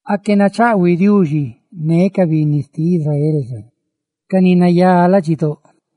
¡Aque nachaꞌhuiꞌ Diuxi ne ca binni xtiꞌ Israel xa, ca ni nayá ladxidóꞌ!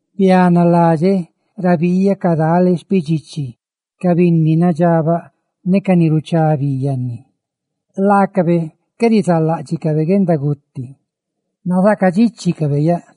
Bianaladxeꞌ ra biiyaꞌ cadale xpidxichi ca binni nadxabaꞌ ne ca ni ruchá bi yanni. Laacabe qué rizaaláꞌdxicabe guendaguti, nazaacadxichicabe yaꞌ;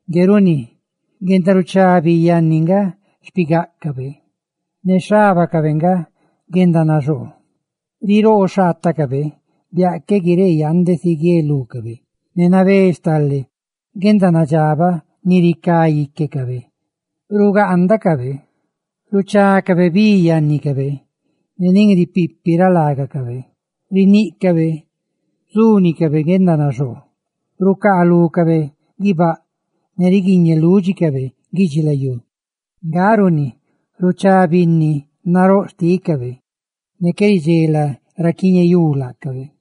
Ngue runi guendaruchá bi yanni nga xpigáꞌcabe ne xhábacabe nga guendanaxoo; riroo xhaatacabe biaꞌ qué guiree yande si guielúcabe, ne nabé stale guendanadxabaꞌ ni ricá íquecabe. Rugaandacabeꞌ, ruchácabe bi yannicabe ne nin ripipi ra lágacabe, riníꞌcabe zúnicabe guendanadxabaꞌ ne guendanaxoo; rucaalúcabe guibáꞌ ne ruaacabe, ne riguiñe lúdxicabe guidxilayú. Nga nga runi ruchá binni naróꞌ xtícabe, ne qué ridxela ra quiñeyú laacabe.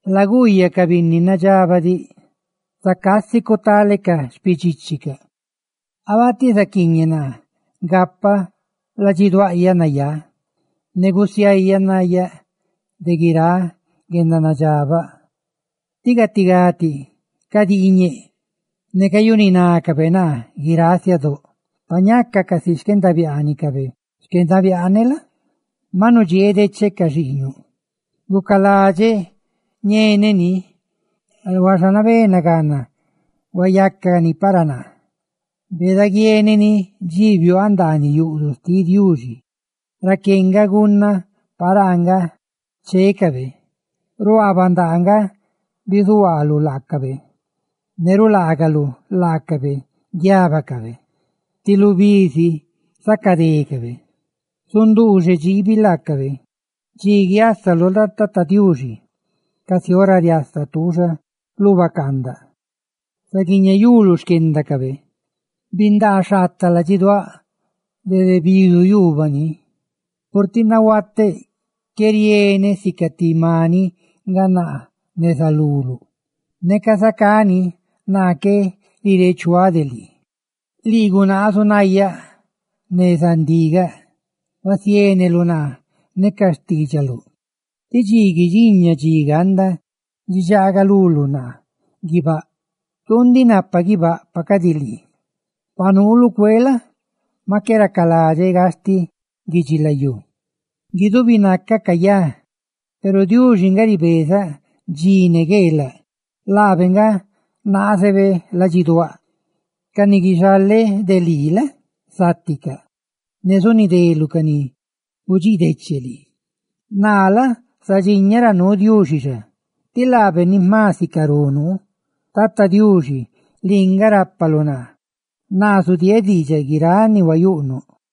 ¡Laguuyaꞌ ca binni nadxabaꞌ diꞌ! Zacá si cutálecaꞌ xpidxíchicaꞌ. ¡Abatiꞌ zaquiiñeꞌ naa gapaꞌ ladxiduaꞌyaꞌ nayá ne quiibeꞌ nayáꞌ de guiráꞌ guendanadxabaꞌ! Tí gatigá cadiiñeꞌ, ne cayuninácabe naa guiráꞌ siadóꞌ. Pa ñaca casi xquendabiaanicabe xquendabiaaneꞌ la? maꞌ nudxieeꞌ decheꞌ ca xiiñuꞌ. Gucaladxeꞌ ñeneꞌ ndiꞌ, huaxa nabé nagana gucani para naa. Beeda guieneꞌ ni dxi biuaaꞌ ndaaniꞌ yuꞌduꞌ xtiꞌ Diuxi, raqué nga gunnaꞌ paraa nga chécabe; ruaa bandaa nga bizuhuaaluꞌ laacabe, ne rulaanouꞌ laacabe guiábacabe. ¡Ti lu bi si zacadécabe! ¡Zunduuxeꞌ dxiibi laacabe! Dxi guiásaluꞌ la? Tata Diuxi, casi ora riasa tuuxa lu bacaandaꞌ, zaguiñeyuluꞌ xquendacabe. Bindáꞌ xhaataꞌ ladxiduáꞌ dede bidu yuubaꞌ ni, purtiꞌ nahuateꞌ qué rieneꞌ; ¡sica ti maniꞌ nga naa neza luluꞌ! Neca zacá ni, naa qué nireechuáꞌ de lii. Lii gunaazuꞌ nayaꞌ neza ndigaꞌa, huasiéneluꞌ naa ne ca xtiidxaluꞌ tí dxi guidxiña dxi ganda guidxagaluluꞌ naa guibáꞌ. Tuu ndiꞌ napaꞌ guibáꞌ yaꞌ. ¡Pa cadi lii! Pa nuuluꞌ cueeꞌ la? maꞌ qué racaladxeꞌ gastiꞌ lu guidxilayú. Guidubi nacaꞌ cayá, peru Diuxi nga ribezaꞌ dxi ne gueelaꞌ laabe nga naazebe ladxiduáꞌ. Ca ni guixaleꞌ de lii la? záticaꞌ; ne zunideluꞌ ca ni gudxiideche lii. Naa la? zadxiñaꞌ ra nuu Diuxi xa, tí laabe nga ni jma sicarú nuu. Tata Diuxi, lii nga rápaluꞌ naa, naa zudieeꞌ diidxaꞌ guiráꞌ ni huayuꞌnuꞌ.